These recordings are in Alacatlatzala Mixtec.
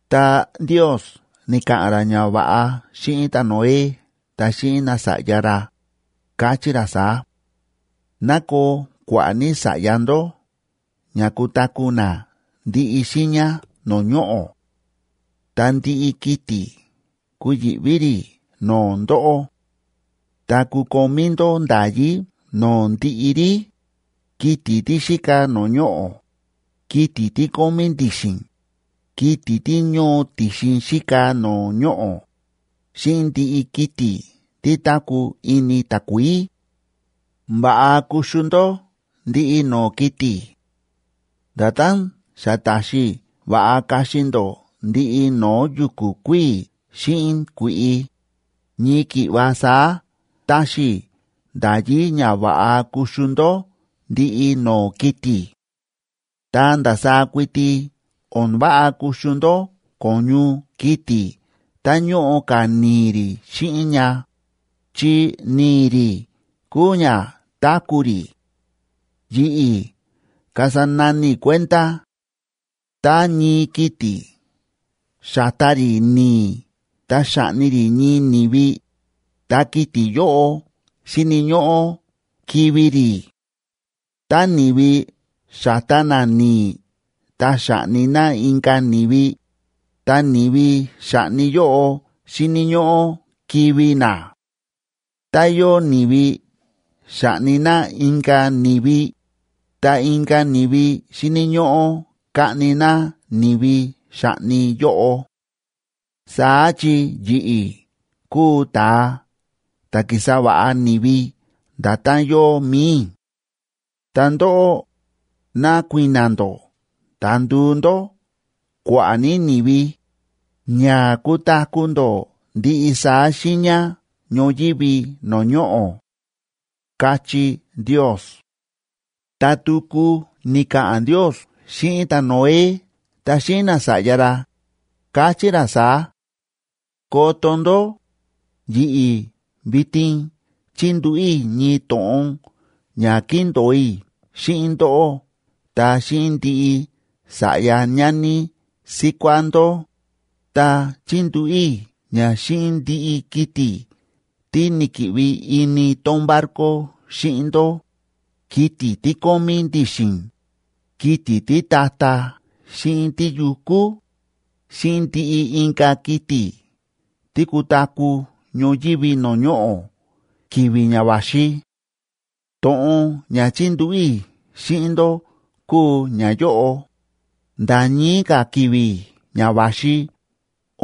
Ta Ndios ni̱ka̱ꞌa̱n ra ñava̱ꞌa xíꞌin ta̱Noé ta xíꞌin nasa̱ꞌya ra, káchí ra saá: ―Ná koo kua̱ꞌa̱ ní sa̱ꞌya ndó ña kutaku̱ na ndiꞌi xiiña no̱o̱ ñoꞌo̱. Ta ndiꞌi kiti̱ kuyi̱ꞌví rí no̱o̱ ndóꞌó; ta kukomí ndó nda̱yí no̱o̱ ndiꞌi rí, kiti̱ tí xíka no̱o̱ ñoꞌo̱, kiti̱ tí kómí ndi̱xi̱n, kiti̱ tí ñóo ti̱xin xíka no̱o̱ ñoꞌo̱, xíꞌin ndiꞌi kiti̱ tí táku̱ ini takuií. Va̱ꞌa kuxu ndó ndiꞌi no̱o̱ kiti̱. Nda̱tán xa ta̱xi i̱ va̱ꞌa kaxi ndó ndiꞌi no̱o̱ yu̱ku̱ kuíi̱ xíꞌin kui̱ꞌi, ñii ki̱ꞌva saá táxi i̱ nda̱yí ña va̱ꞌa kuxu ndó ndiꞌi no̱o̱ kiti̱. Ta ndasaá kuiti o̱n váꞌa kuxu ndó ko̱ñu kiti̱ tá ñóꞌo ka̱ ni̱i̱ rí xíꞌin ña, chi ni̱i̱ rí kúu ña táku̱ rí. Yi̱ꞌi̱ kasa nani i̱ kuenda. Tá ñii kiti̱ xa̱ta rí ni̱i̱ ta xa̱ꞌni rí ñii ni̱vi, ta kiti̱ yóꞌo xíni̱ ñóꞌó kivi̱ rí. Tá ni̱vi xa̱ta na ni̱i̱ ta xa̱ꞌni na inka̱ ni̱vi, ta ni̱vi xa̱ꞌni yóꞌo xíni̱ ñóꞌó kivi̱ na. Tá yóo ni̱vi xa̱ꞌni na inka̱ ni̱vi, ta inka̱ ni̱vi xíni̱ ñóꞌó kaꞌni na ni̱vi xa̱ꞌni yóꞌo, saá chi yi̱ꞌi̱ kúu ta̱a ta̱ ki̱sa va̱ꞌa ni̱vi nda̱tán yóo mi̱i i̱. Ta ndóꞌó, ná kui̱na̱ ndó ta nduu ndó kua̱ꞌa̱ ní ni̱vi, ña kutaku̱ ndó ndiꞌi saá xiiña ñoyívi no̱o̱ ñoꞌo̱ ―káchí Ndios. Ta tuku ni̱ka̱ꞌa̱n Ndios xíꞌin ta̱Noé ta xíꞌin nasa̱ꞌya ra, káchí ra saá: ―Koto ndó, yi̱ꞌi̱ vitin chíndúꞌu̱ i̱ ñii to̱ꞌon ña kíndo̱o i̱ xíꞌin ndóꞌó ta xíꞌin ndiꞌi sa̱ꞌya ñani síkuá ndó, ta chíndúꞌu̱ i̱ ña xíꞌin ndiꞌi kiti̱ tí ni̱ki̱ꞌvi ini tón barco xíꞌin ndó, kiti̱ tí kómí ndi̱xi̱n, kiti̱ títa̱ta̱ xíꞌin tíyukú, xíꞌin ndiꞌi inka̱ kiti̱ tí kutaku̱ ñoyívi no̱o̱ ñoꞌo̱ ki̱vi̱ ña va̱xi. To̱ꞌon ña chíndúꞌu̱ i̱ xíꞌin ndó kúu ñayóꞌo: nda̱ ñii ka̱ ki̱vi̱ ña va̱xi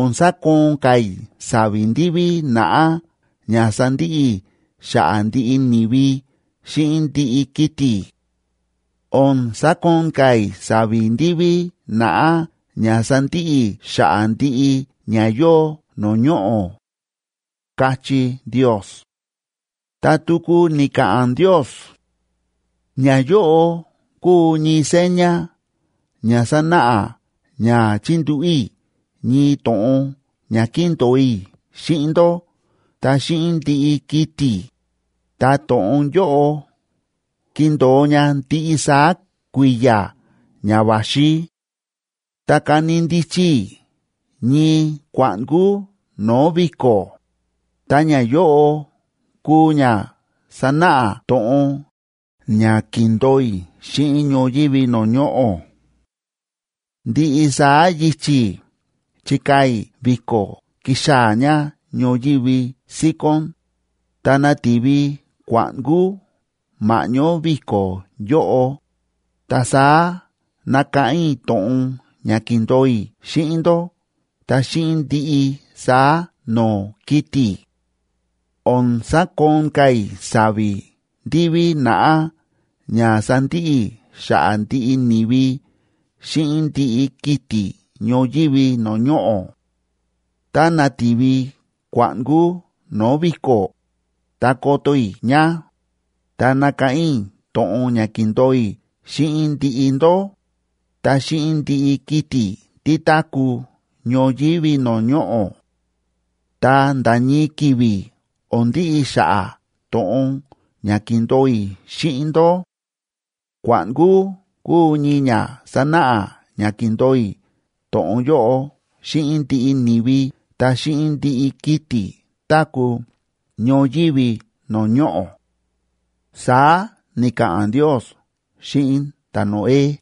o̱n sakoon ka̱ i̱ sa̱vi̱ ndiví naꞌá ña sandiꞌi i̱ xa̱ꞌa̱ ndiꞌi ni̱vi xíꞌin ndiꞌi kiti̱. O̱n sakoon ka̱ i̱ sa̱vi̱ ndiví naꞌá ña sandiꞌi i̱ xa̱ꞌa̱ ndiꞌi ña yóo no̱o̱ ñoꞌo̱ ―káchí Ndios. Ta tuku ni̱ka̱ꞌa̱n Ndios: ―Ñayóꞌo kúu ñii seña ña sanáꞌa ña chíndúꞌu̱ i̱ ñii to̱ꞌon ña kíndo̱o i̱ xíꞌin ndó ta xíꞌin ndiꞌi kiti̱, ta to̱ꞌon yóꞌo kindo̱o ña ndiꞌi saá kui̱ya̱ ña va̱xi: Ta ka̱ni ndichi i̱ ñii kua̱ꞌnkúa no̱o̱ vi̱ko̱, ta ñayóꞌo kuu ña sanáꞌa to̱ꞌon ña ki̱ndo̱o i̱ xíꞌin ñoyívi no̱o̱ ñoꞌo̱. Ndiꞌi saá yichi̱ chikaa̱ i̱ vi̱ko̱ kixaa̱ ña ñoyívi síkón, ta nati̱vi kua̱ꞌnkú ma̱ꞌñó vi̱ko̱ yóꞌo, ta saá nakáꞌán i̱ to̱ꞌon ña ki̱ndo̱o i̱ xíꞌin ndó ta xíꞌin ndiꞌi saá no̱o̱ kiti̱. O̱n sakoon ka̱ i̱ sa̱vi̱ ndiví naꞌá ña sandiꞌi i̱ xa̱ꞌa̱ ndiꞌi ni̱vi xíꞌin ndiꞌi kiti̱ ñoyívi no̱o̱ ñoꞌo̱. Tá nati̱vi kua̱ꞌnkú no̱o̱ vi̱ko̱, ta koto i̱ ña, ta nakáꞌán i̱ to̱ꞌon ña ki̱ndo̱o i̱ xíꞌin ndiꞌi ndó, ta xíꞌin ndiꞌi kiti̱ tí táku̱ ñoyívi no̱o̱ ñoꞌo̱. Ta nda̱ ñii ki̱vi̱ o̱n ndiꞌi xa̱ꞌa̱ to̱ꞌon ña ki̱ndo̱o i̱ xíꞌin ndó. Kua̱ꞌnkú kuu ñii ña sanáꞌa ña ki̱ndo̱o i̱ to̱ꞌon yóꞌo xíꞌin ndiꞌi ni̱vi ta xíꞌin ndiꞌi kiti̱ táku̱ ñoyívi no̱o̱ ñoꞌo̱ ―saá ni̱ka̱ꞌa̱n Ndios xíꞌin ta̱Noé.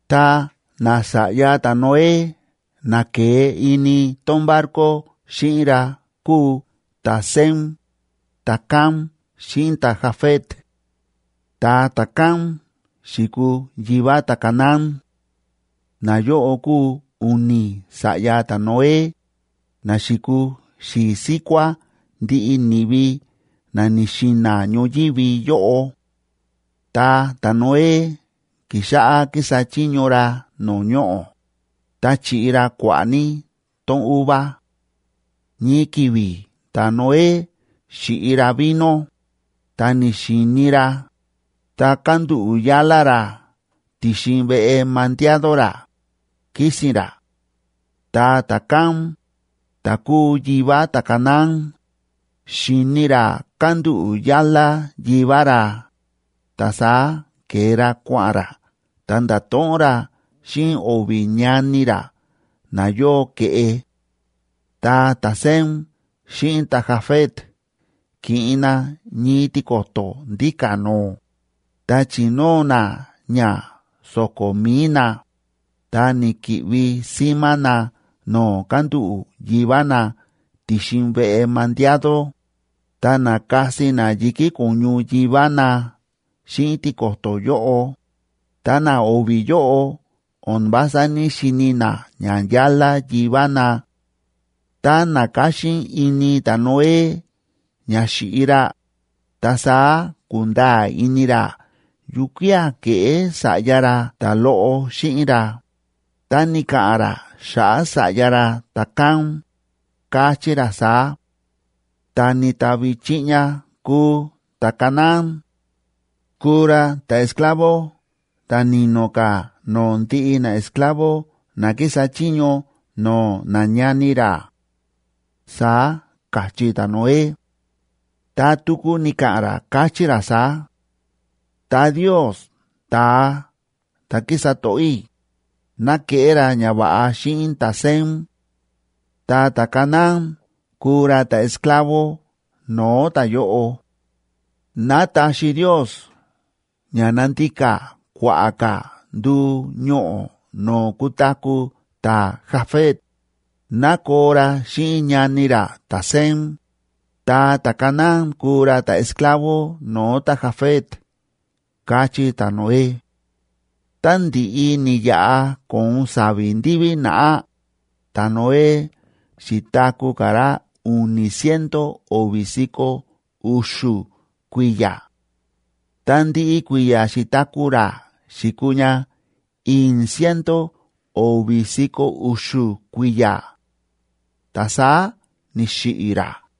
Ta nasa̱ꞌya ta̱Noé na ke̱e ini tón barco xíꞌin ra kúu ta̱Sem, ta̱Cam xíꞌin ta̱Jafet. Ta ta̱Cam xi̱kuu yivá ta̱Canaán. Nayóꞌo kúu u̱ni̱ sa̱ꞌya ta̱Noé, na xi̱kuu xi̱i̱ síkuá ndiꞌi ni̱vi na ni̱xi̱na̱ ñoyívi yóꞌo. Ta ta̱Noé ki̱xáꞌá kísa chiño ra no̱o̱ ñoꞌo̱, ta chi̱ꞌi ra kua̱ꞌa̱ ní tón uva. Ñii ki̱vi̱ ta̱Noé xi̱ꞌi ra vino, ta ni̱xi̱i̱ni ra, ta kándúꞌu̱ yálá ra ti̱xin veꞌe mandiado ra, kísi̱n ra. Ta ta̱Cam, ta̱ kúu yivá ta̱Canaán, xi̱ni ra kándúꞌu̱ yálá yivá ra, ta saá ke̱e ra kua̱ꞌa̱n ra ta nda̱to̱ꞌon ra xíꞌin o̱vi̱ ñani ra na yóo ke̱ꞌe. Ta ta̱Sem xíꞌin ta̱Jafet ki̱ꞌin na ñii tiko̱to̱ ndíka̱ no̱o̱, ta chi̱nóo na ña so̱ko̱ mi̱i na, ta ni̱ki̱ꞌvi símá na no̱o̱ kándúꞌu̱ yivá na ti̱xin veꞌe mandiado, ta na̱kasi na yi̱kí ko̱ñu yivá na xíꞌin tiko̱to̱ yóꞌo, ta na o̱vi̱ yóꞌo o̱n vása ní‑xini na ñayálá yivá na. Tá na̱káxín ini ta̱Noé ña xi̱ꞌi ra, ta saá ku̱nda̱a̱ ini ra yukía̱ ke̱ꞌé sa̱ꞌya ra ta̱loꞌo xíꞌin ra, ta ni̱ka̱ꞌa̱n ra xa̱ꞌa̱ sa̱ꞌya ra ta̱Cam, káchí ra saá: ¡Ta̱ ni̱tavi chiꞌña kúu ta̱Canaán! ¡Kuu ra ta̱esclavo,b ta̱ ni̱no̱ ka̱ no̱o̱ ndiꞌi naesclavo na kísa chiño no̱o̱ nañani ra!, saá káchí ta̱Noé. Ta tuku ni̱ka̱ꞌa̱n ra, káchí ra saá: Ta Ndios,c ta̱a ta̱ kísa to̱ꞌó i̱, ná keꞌé ra ñava̱ꞌa xíꞌin ta̱Sem. Ta ta̱Canaán kuu ra ta̱esclavo no̱o̱ ta̱yóꞌo. Ná taxi Ndios ña nandika kua̱ꞌa̱ ka̱ nduu ñoꞌo̱ no̱o̱ kutaku̱ ta̱Jafet, ná koo ra xíꞌin ñani ra ta̱Sem, ta ta̱Canaán kuu ra ta̱esclavo no̱o̱ ta̱Jafet, káchí ta̱Noé. Tá ndi̱ꞌi ni̱yaꞌa ko̱on sa̱vi̱ ndiví naꞌá, ta̱Noé xi̱taku̱ ka̱ ra u̱ni̱ ciento o̱vi̱ si̱ko̱ u̱xu̱ kui̱ya̱. Ta ndiꞌi kui̱ya̱ xi̱taku̱ ra xi̱kuu ña i̱i̱n ciento o̱vi̱ si̱ko̱ u̱xu̱ kui̱ya̱, ta saá ni̱xiꞌi̱ ra.